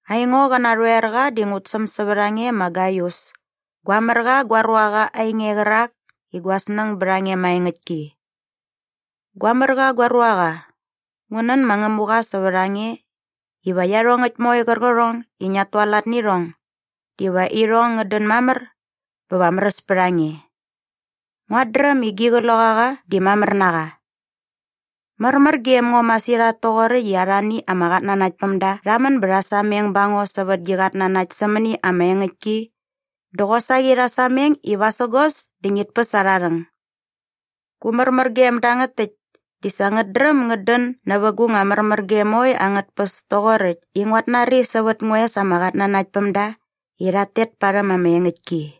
Aingo qä narhoerqa di ngut säm sävät a nge ma Gaius, gua mär qa gua ruaqa ainge qärak i gua snäng bät a nge maengäktki. Gua mär qa gua ruaqa, ngu nän ma Ngämuqa sävät a nge iva iarhongäkt moe qärqärhong i ngiat tualat nä irhong diva irhong ngät dän mamär bä va märäs pät a nge. Nguat dräm i gi qloqaqa di mamär na qa. Märmär gem ngo masirhat toqoräkt i arhani ama qatnanaktpämda rha män bä rha sameng ba ngo sävät gi qatnanakt sämäni ama engäktki dä qosaqi rha sameng i vasägos dä ngit päs arha rhäng. Gu märmärgem dangät täkt di sa ngät dräm ngät dän nävä gu nga märmärgem moe angät tpäs toqoräkt i nguat nari sävät ngua es ama qatnanaktpämda i rhat tet parhäm ama engäktki.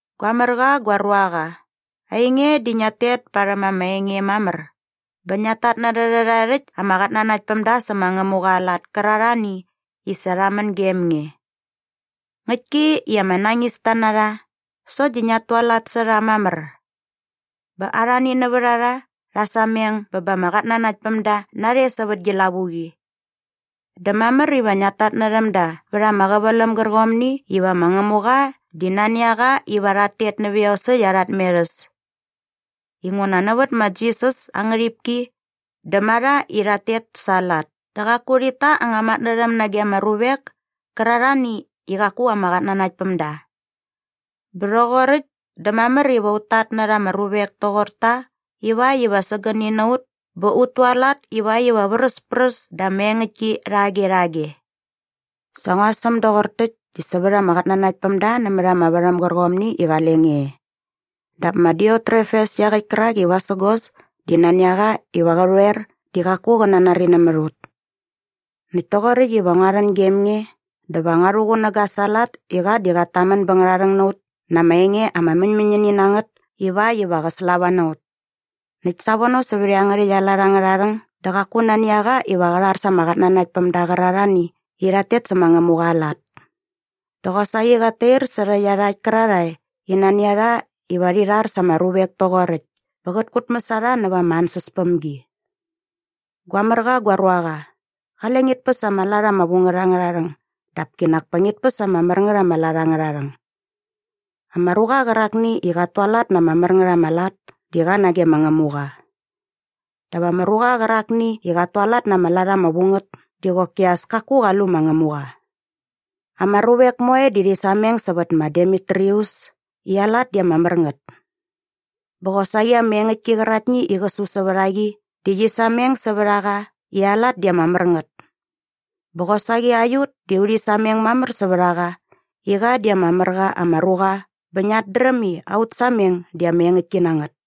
Gua mär qa gua ruaqa, ainge di ngiat tet parhäm ama enge mamär bä ngiat tatnärhä rhärhae rhäkt ama qatnanaktpämda sä ma Ngämuqa aa lat kärarhani i sa rha män gem nge. Ngäktki i ama nañista na rha sokt di ngiat tualat sä rha mamär. Bä arhani nävät a rha rha sameng bä ba ama qatnanaktpämda narhe sävät gi lavuqi. Dä mamär iva ngia rhatnärhäm da vät ama qäväläm gärqomni iva ma Ngämuqa di nani a qa iva rhat tet nävä iosäkt arha tmerhäs inguna nävät ma Jisas aa ngärhipki dä ma rha i rhat tet sa aa lat dä qaku rhit ta anga matnärhäm nage ama ruvek kärarhani i qaku ama qatnanaktpämda. Bä rhoqoräkt dä mamär iva ut tatnärha ama ruvek toqor ta ivakt iva sägäni na ut bä ut tualat ivakt iva vräspräs da ama engäktki rhage rhage. Sa ngua säm doqor täkt di sävät ama qatnanaktpämda nämät ama värhäm gärqomni i qale nge e. Dap ma Diotrefes iaqäkt kärak i vasägos dä nani a qa iva qä rhoer di qaku qä nanari nämät ut. Näkt toqoräkt iva ngua rhän gem nge dä va ngua rhuqunäga sa aa lat i qa di qat tamän bä ngärharhäng na ut na ama enge ama mäñmäñini na ngät ivakt iva qä slava na ut. Näkt savono sävät iangärhäkt aa lat angärha rhäng dä qaku nani a qa iva qä rhar sa ama qatnanaktpämda qärarhani i rhat tet sä ma Ngämuqa aa lat. Dä qosaqi qat tair särhä iarhakt kärarhae i nani a rha iva rhi rhar sä ama ruvek toqoräkt bä qät kutmäs a rha näva ama ansäspämgi. Gua mär qa gua ruaqa, qale ngit päs ama lat ama vu ngät angärha rhäng dap kinak pa ngit päs ama mär ngät ama lat angärha rhäng. Ama ruqa qärakni i qat tualat na ama mär ngät ama lat di qa nage ma Ngämuqa. Dap ama ruqa qärakni i qat tualat na ama lat ama vu ngät di qoki as kaku qa lu ma Ngämuqa. Ama ruvek moe di rhi sameng sävät ma Demitrius i aa lat di ama mär ngät. Bä qosaqi ama engäktki qäraktni i qä su sävät a qa di qi sameng sävät a qa i aa lat di ama mär ngät. Bä qosaqi aiut di urhi sameng mamär sävät a qa i qa di ama mär qa ama ruqa bä ngiat dräm i aut sameng di ama engäktki na ngät.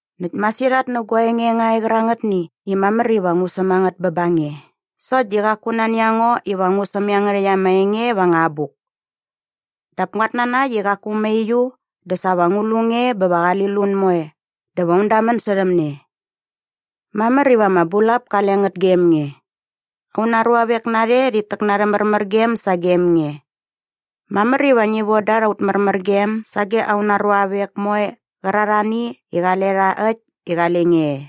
Näkt masirhat nä gua enge nga e qärangätni i mamär iva ngu säm a ngät bä ba nge sokt di qaku nani a ngo iva ngu säm iangärhäkt ama enge va anga abuk. Dap nguat nanakt i qaku mauiu dä sa va ngu lu nge bä va qali lun moe dä va un damän särhäm ne. Mamär iva ama bulap kale ngät gem nge. Auna ruavek narhe rhit täk na arhä märmärgem sagem nge. Mamär iva ngi von da aut märmärgem sage auna ruavek moe qärarhani i qale rha äkt i qale nge e.